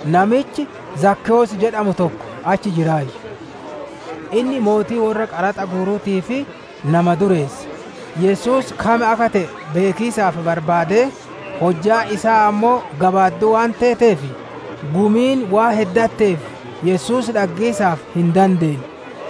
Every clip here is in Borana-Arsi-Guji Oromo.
Namichi Zakkewoos jedhamu tokko achi jiraayyu. Inni mootii worra qaraxa guuruutii fi nama dureessa. Yesuus kam akka te'e beekiisaaf barbaadee, hojjaan isaa ammoo gabaadduu waan teeteef, gumiin waan heddatteef Yesuus dhaggiisaaf hin dandeenne.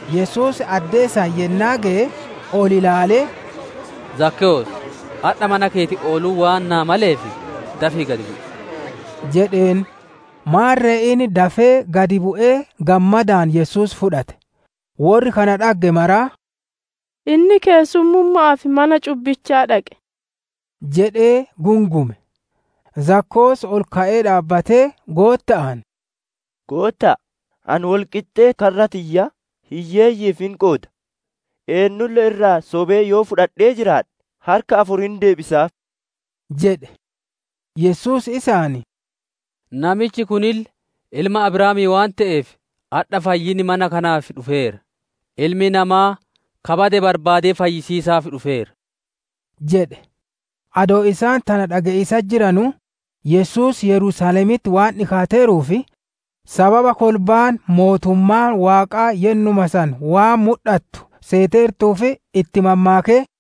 Yesuus addee san yennaa geye, ol ilaalee, «Zakkewoos, adha mana keeti ooluun waan naa maleef, dafii gad bu'i» jedheen. Maarre inni dafee gad bu'ee gammadaan Yesuus fudhate. Worri kana dhagge maraa, «Inni keessummumma'aaf mana cubbichaa dhaqe» jedhee gungume. Zakkewoos ol ka'ee dhaabbatee Gootta'aan, «Gootta'a! Ani wol qixxee karra tiyyaa hiyyeeyyi'iif hin qooda, eennulle irraa sobee yoo wo fudhadhee jiraadhe, harka afur hin deebisaaf» jedhe. Yesuus isaan, «Namichi kunille ilma Abrahaamii waan te'eef, adha fayyinni mana kanaaf dhufeera. Ilmi Namaa ka bade barbaadee fayyisiisaaf dhufeera» jedhe. Adoo isaan tana dhage'iisatti jiranuu, Yesuus Yerusaalemitti waan dhikaateeruuf, sababa kolbaan mootummaan Waaqaa yennuma san waan mudhattu seeteertuuf, itti mammaakee,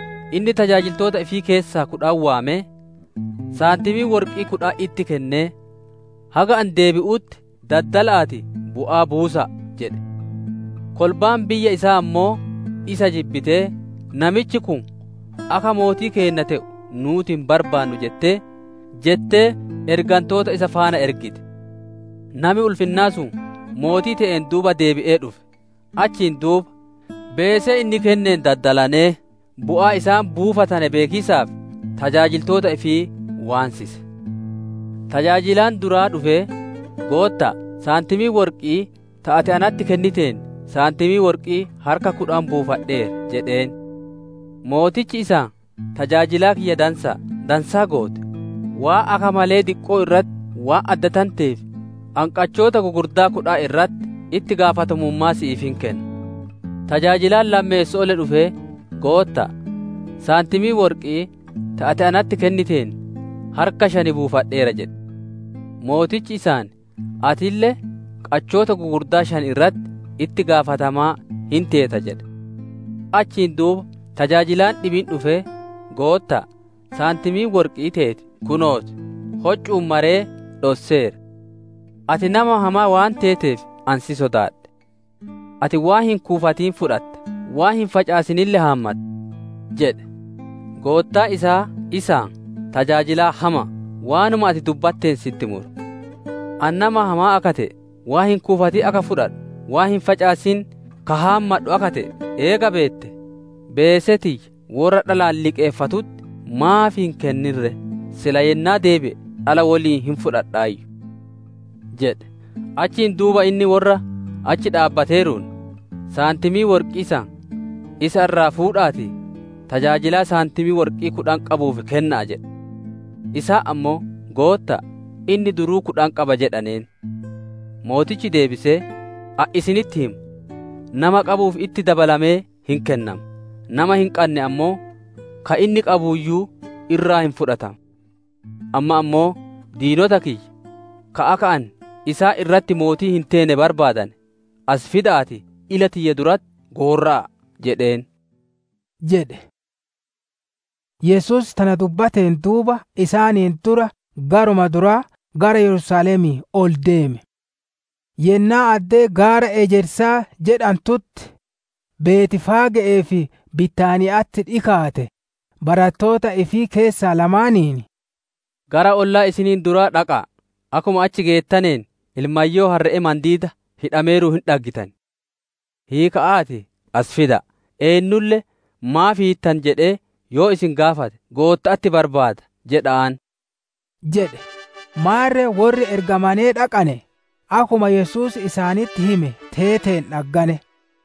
Inni tajaajiltoota ifii keessaa kudhan waamee, saantimii worqi'ii kudhan itti kennee, ‹Haga ani deebi'utti daddala'aatii bu'aa buusa'a› jedhe. Kolbaan biyya isaa ammoo isa jibbitee, ‹Namichi kun akka mootii keenna te'u nuuti hin barbaannu› jettee ergantoota isa faana ergite. «Nami ulfinnaa sun mootii te'een duuba deebi'ee dhufe. Achiin duuba, beesee inni kenneen daddalanee, bu'aa isaan buufatane beekiisaaf tajaajiltoota ifii waansise. Tajaajilaan duraa dhufee, ‹Gootta'a, saantimii worqi'ii ta ati natti kenniteen, saantimii worqi'ii harka kudhan buufadheera› jedheen. Mootichi isaan, ‹Tajaajilaa kiyya dansa'a, dansaa goote! Waan akka malee diqqoo irratti waan addatanteef, ani qachoota gugurdoo kudhan irratti itti gaafatamummaa si'iif hin kenna› jedhe. Tajaajilaan lammeesso'oolle dhufee, ‹Gootta'a, saantimii worqi'ii ta ati natti kenniteen harka shan buufadheera› jedhe. Mootichi isaan, ‹Atille, qachoota gugurdaa shan irratti itti gaafatamaa hin teeta› jedhe. Achiin duuba tajaajilaan dhibiin dhufee, ‹Gootta'a, saantimiin worqi'ii teeti kunoo ti; hoccu'uun maree dhosseera. Ati nama hamaa waan teeteef ani si sodaadhe. Ati waan hin kuufatin fudhata, waan hin facaasinille haammatta› jedhe. Goottaan isaa, isaan, ‹Tajaajilaa hama'a! Waanuma ati dubbatteen sitti mura. Ani nama hamaa akka te'e, waan hin kuufatin ka fudhadhu, waan hin facaasin ka haammadhu akka te'e eega beettee, beesee tiyya worra dhalaan liqeeffatutti maaf hin kennine ree? Silaa yennaa deebi'e, dhala woliin hin fudhadhaayyu› jedhe. Achiin duuba inni worra achi dhaabbateeruun, ‹Saantimii worqi'ii san isa irraa fuudha'aatii tajaajilaa saantimii worqi'ii kudhan qabuuf kenna'a!› jedhe. Isaan ammoo, ‹Gootta'a, inni duruu kudhan qaba!› jedhaneen. Mootichi deebisee, ‹Ani isinitti hima, nama qabuuf itti dabalamee hin kennama; nama hin qanne ammoo ka inni qabuuyyu irraa hin fudhatama. Amma ammoo diinota kiyya ka akka ani isaan irratti mootii hin teene barbaadane, as fida'aatii ila tiyya duratti gorra'a'a!› jedheen» jedhe. Yesuus tana dubbateen duuba isaaniin dura garuma duraa gara Yerusaalemii ol deeme. Yennaa addee gaara ejersaa jedhantutti, Betfaage'ee fi Bitaaniya'atti dhikaate, barattoota ifii keessaa lamaaniin, «Gara olloota isiniin duraa dhaqa'a; akkuma achi geettaneen ilmayyoo harre'ee mandiida hidhameeruun hin dhaggitan. Hiika'aatii as fida'a. Eennulle, ‹Maaf hiittan?› jedhee yoo isin gaafate, ‹Gootta'atti barbaada› jedha'aan» jedhe. Maarre worri ergamane dhaqanee, akkuma Yesuus isaanitti hime teeteen dhaggane.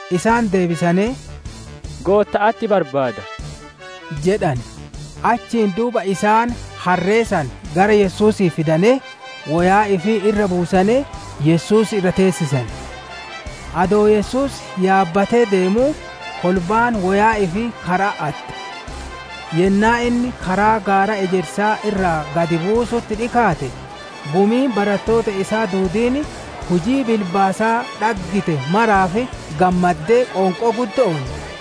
Isaan deebisanee, «Gootta'atti barbaada» jedhane. Achiin duuba isaan harree san gara Yesuusii fidanee, woyaa ifii irra buusanee Yesuus irra teessisane. Adoo Yesuus yaabbatee ideemuu, kolbaan woyaa ifii kara'atti atte. Yennaa inni karaa gaara ejersaa irraa gad buusutti dhikaate, gumiin barattoota isaa duudiin, hujii bilbaasaa dhaggite maraaf gammaddee, qoonqoo guddo'oon,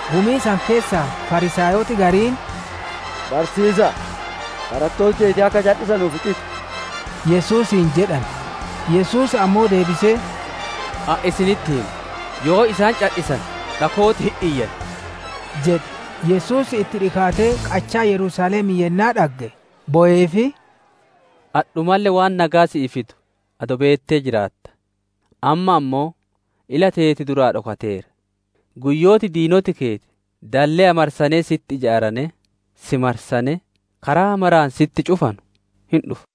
Gumii san keessaa Fariisaayoti gariin, «Barsiisa'a, barattooti teeti akka cadhisanuuf xixi!» Yesuusiin jedhane. Yesuus ammoo deebisee, «Ani isinitti hima, yoo isaan cadhisane, dhakooti hin iyyan» jedhe. Yesuus itti dhikaatee qachaa Yerusaalemii yennaa dhagge, boweefii, «Adhumalle waan nageya si'ii fidu adoo beettee jiraattaa! Amma ammoo ila teeti duraa dhokateera! Guyyooti diinoti keeti dalleya marsanee sitti ijaaranee, si marsanee, karaa maraan sitti cufanu hin dhufa.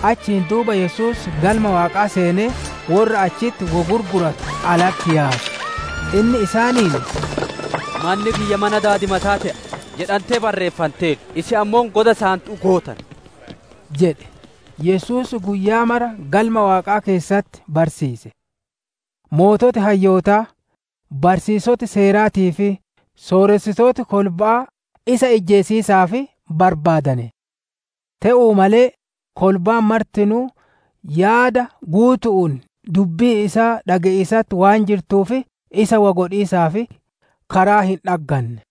Achiin duuba Yesuus Galma Waaqaa seenee, worra achitti wo gurguratu alatti yaase. Inni isaaniin, « ‹Manni kiyya mana daadimataa te'a› jedhantee barreeffanteerti; isin ammoo goda saantu'uu gootane» jedhe. Yesuus guyyaa mara Galma Waaqaa keessatti barsiise. Sooreyyiin hayyootaa, barsiisoti Seeraatii fi sooressitooti kolba'aa isa ijjeesiisaaf barbaadane. Te'uu malee, kolbaan martinuu yaada guutu'uun dubbii isaa dhage'iisatti waan jirtuuf isa wo godhiisaaf karaa hin dhagganne.